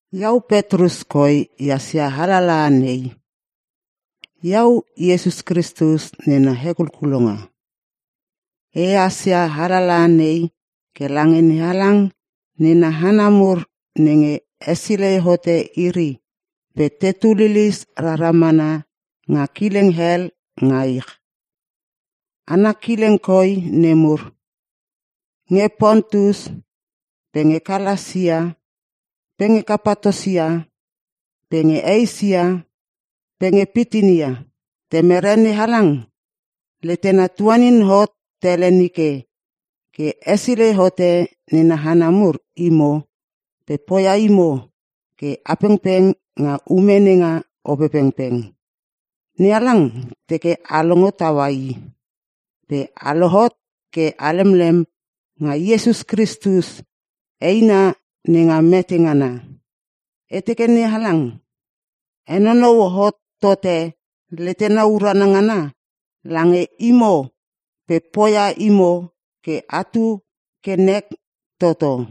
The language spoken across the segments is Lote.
Iau Petrus koi ehas ia alalaha nei. Iau Iesus Kristus nena hekulkulonga. E hasia alalaha nei ke lange NeHalang nena hana mur nenge hesilei hote iri pe tetu lilis rara mana nga kileng hel nga ich. Ana kileng koi nemur: Nge Pontus pe nge Kalasia pe nge Kapatosia pe nge Eisia pe nge Pitinia. Temere NeHalang letena tuanin hot tele nike ke hesilei hote nena hana mur imo pe poia imo ke a pengpeng nga ume nenga Opepengpeng. NeHalang teke a longo taua i pe a lohot ke a lemlem nga Iesus Kristus eina nenga mete ngana. E teke NeHalang henonou hot tote letena urana ngana lange imo pe poia imo ke atu ke nek toto.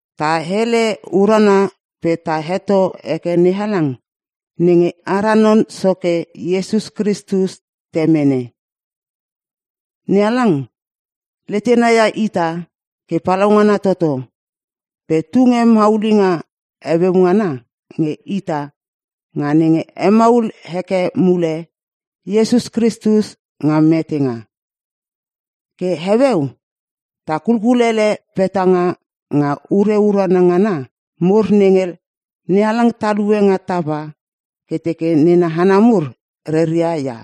Ta hele urana pe ta heto heke NeHalang nenge ara Non Soke Iesus Kristus Temene. NeHalang letena ia ita ke palaungana toto pe tunge maulinga heueu ngana nge ita nga nenge hemaul heke mule Iesus Kristus nga metenga. Ke heueu ta kulkulele petanga nga ure urana ngana mur nenge NeHalang talue nga tapa ke teke nena hana mur reria ia.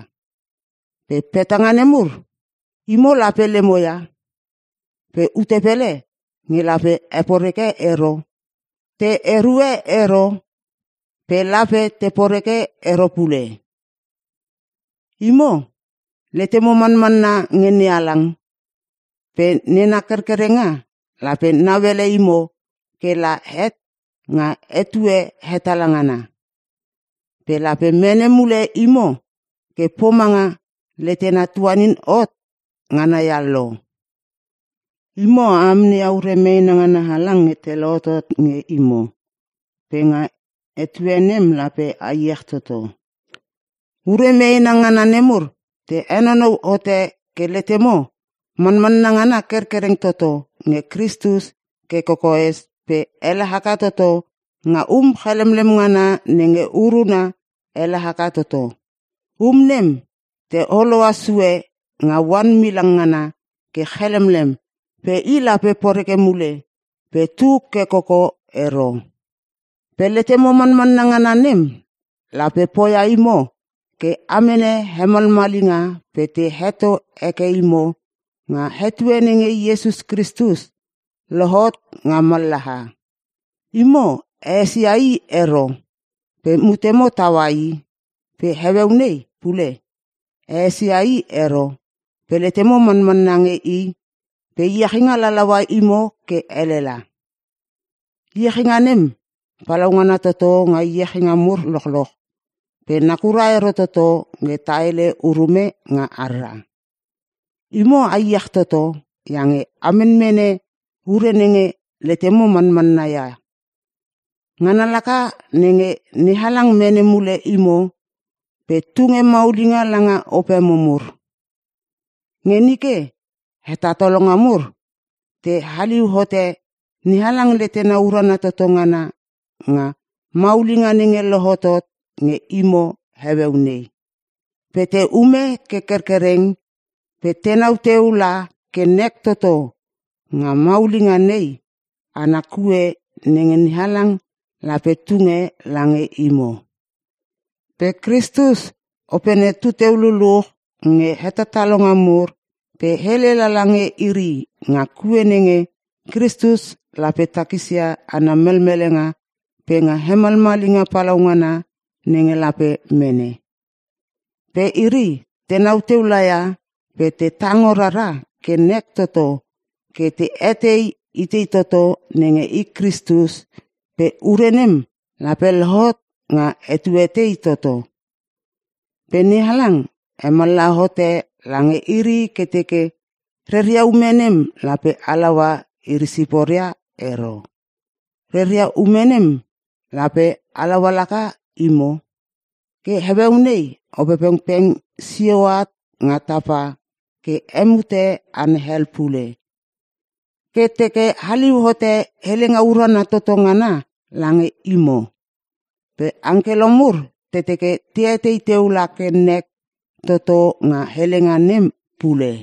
Ke petanga nemur, imo lape lemo ia, pe ute pele nge lape heporeke ero pe te erue ero pe lape te poreke ero pule. Imo letemo manmanna nge NeHalang pe nena kerkerenga lape nauele imo ke la het nga etue hetala ngana. Pe lape mene mule imo ke pomanga letena tuanin hot ngana ia lo. Imo a amneia ure meena ngana halang nge te lohotot nge imo, pe nga etue nem lape a iech toto. Ure meena ngana nemur te henonou hote ke letemo manmanna ngana kerkereng toto nge Kristus ke kokoes pe ele haka toto nga um chalemlem ngana nenge uruna ele haka toto. Um nem te holoa sue nga oan milang ngana ke chalemlem pe i lape poreke mule pe tu ke koko ero. Pe letemo manmanna ngana nem lape poia imo ke a mene hemalmalinga pe te heto heke imo nga etue nenge Iesus Kristus lohot nga mallaha. Imo a esia i ero pe mutemo taua i pe heueu nei pule a esia i ero pe letemo manmanna nge i pe iechinga lalalaua imo ke elela. Iechinga nem palaungana toto nga iechinga mur lochloch pe nakura ero toto nge ta hele urume nga harra. Imo a iech toto iange a menmene ure nenge letemo manmanna ia – ngana laka nenge NeHalang mene mule imo pe tunge maulinga langa opemo mur. Nge nike hetatalonga mur te haliu hote NeHalang letena urana toto ngana nga maulinga nenge lohotot nge imo heueu nei. Pe te ume ke kerkereng pe tenau teu la ke nek toto nga maulinga nei ana kue nenge NeHalang lape tunge lange imo. Pe Kristus Opene tu teu luluch nge hetatalonga nemur pe hele lala nge iri nga kue nenge Kristus lape takisia ana melmelenga pe nga hemalmalinga palaungana nenge lape mene. Ke iri tenau teu laia pe te tango rara ke nek toto ke te eteia itei toto nenge i Kristus pe ure nem lape lohot nga etue tei toto. Pe NeHalang hemallaha hote lange iri ke teke reria ume nem lape halaua iri siporia ero, reria ume nem lape halaua laka imo. Ke heueu nei Opepengpeng sio at nga tapa ke hemute hana hel pule ke te haliu hote helenga urana toto ngana lange imo. Pe angkelo mur te teke te etei teu la ke nek toto nga helenga nem pule.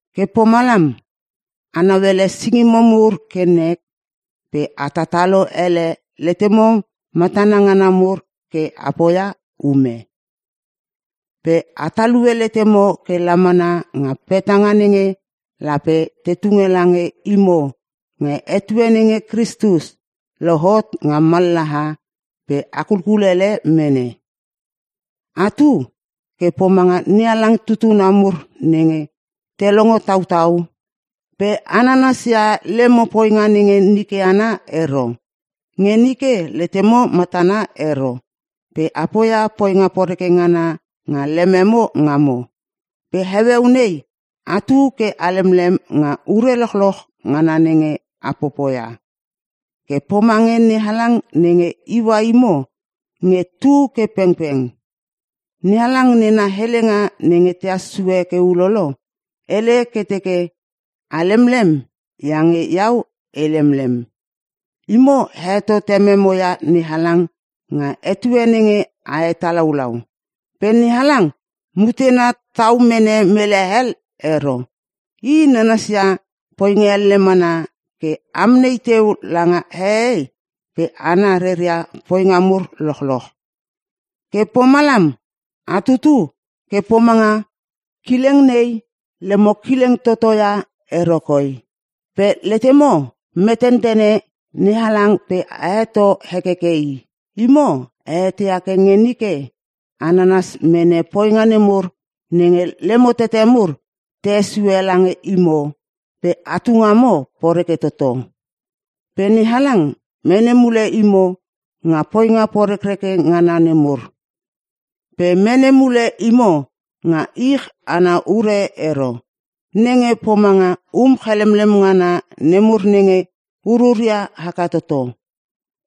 Ke pomalam, a nauele singimo mur ke nek pe a tatalo ele letemo matana ngana mur ke a poia ume. Pe a talue letemo ke la mana nga petanga nenge lape te tunge lange imo nga etue nenge Kristus lohot nga mallaha pe a kulkulele mene. Atu ke pomanga NeHalang tutuna mur nenge te longo tautau pe a nanasia lemo poinga nenge nike ana ero. Nge nike letemo matana ero pe a poia poinga poreke ngana nga lememo ngamo. Pe heueu nei atu ke a lemlem nga ure lochloch ngana nenge a popoia, ke pomange NeHalang nenge iua imo nge tu ke pengpeng. NeHalang nena helenga nenge tehas sue ke ulolo, hele ke teke, “A lemlem iange Iau e lemlem.” Imo a heto tememo ia NeHalang nga etue nenge a hetalaulau. Pe NeHalang mutena tau mene mele hel ero. I nanasia poinga elle mana ke amnei teu langa hehei pe hana reria poinga mur lochloch. Ke pomalam, a tutu ke pomanga kileng nei lemo kileng toto ia ero koi, pe letemo metentene NeHalang pe a heto hekeke i. Imo a eteia ke nge nike a nanas mene poinga nemur nenge lemo tete mur te hesue lange imo pe atu ngamo poreke toto. Pe NeHalang mene mule imo nga poinga porekreke ngana nemur. Pe mene mule imo nga ich ana ure ero (nenge pomanga um chalemlem ngana nemur nenge ururia haka toto)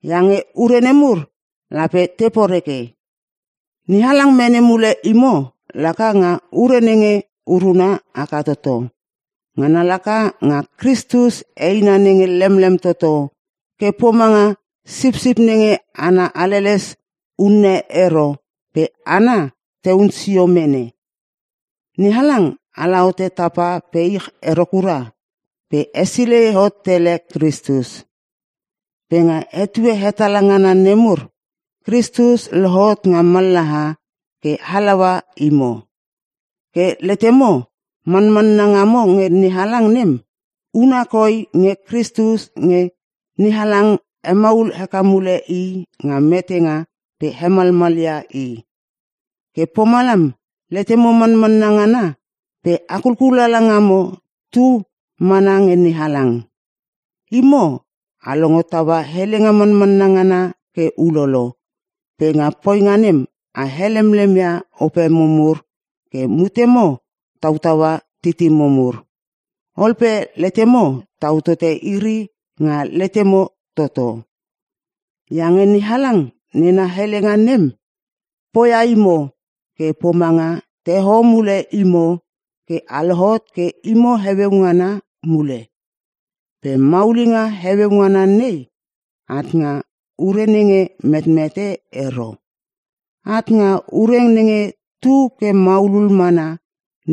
iange ure nemur lape te poreke. NeHalang mene mule imo laka nga ure nenge uruna haka toto. Ngana laka nga Kristus eina nenge lemlem toto ke pomanga sipsip nenge ana haleles unne ero pe hana tehun sio mene. NeHalang ala hote tapa pe ich ero kura pe hesilei hot tele Kristus. Pe nga etue hetala ngana nemur Kristus lohot nga mallaha ke halaua imo. Ke letemo manmanna ngamo nge NeHalang nem, huna koi nge Kristus nge NeHalang hemaul heke mule i nga metenga pe hemalmalia i. Ke pomalam letemo manmanna ngana pe a kulkulala ngamo tu mana nge NeHalang. Imo a longo taua helenga manmanna ngana ke ulolo pe nga poinga nem a helemlem ia opemo mur ke mutemo tautaua titimo mur. Ol pe letemo tau tote iri nga letemo toto. Iange NeHalang nena helenga nem, poia imo ke pomanga te hoho mule imo ke a lohot ke imo heueu ngana mule. Pe maulinga heueu ngana nei at nga ure nenge metmete ero, at nga ure nenge tu ke maulul mana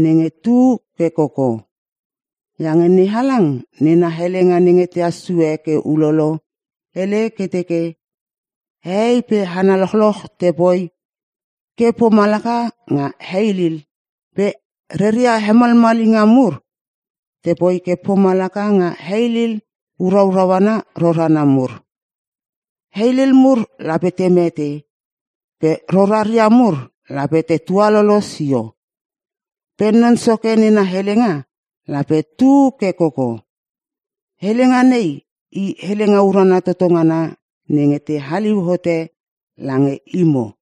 nenge tu ke koko. Iange NeHalang nena helenga nenge tahas sue ke ulolo, hele ke teke, “Hehei pe hana lochloch tepoi ke pomalaka nga heilil. Pe reria hemalmalinga mur tepoi ke pomalaka nga heilil uraurau ana rorana mur. Heilil mur lape te mete pe roraria mur lape te tualolo sio, pe Non Soke nena helenga lape tu ke koko.” Helenga nei i helenga urana toto ngana nenge te haliu hote lange imo.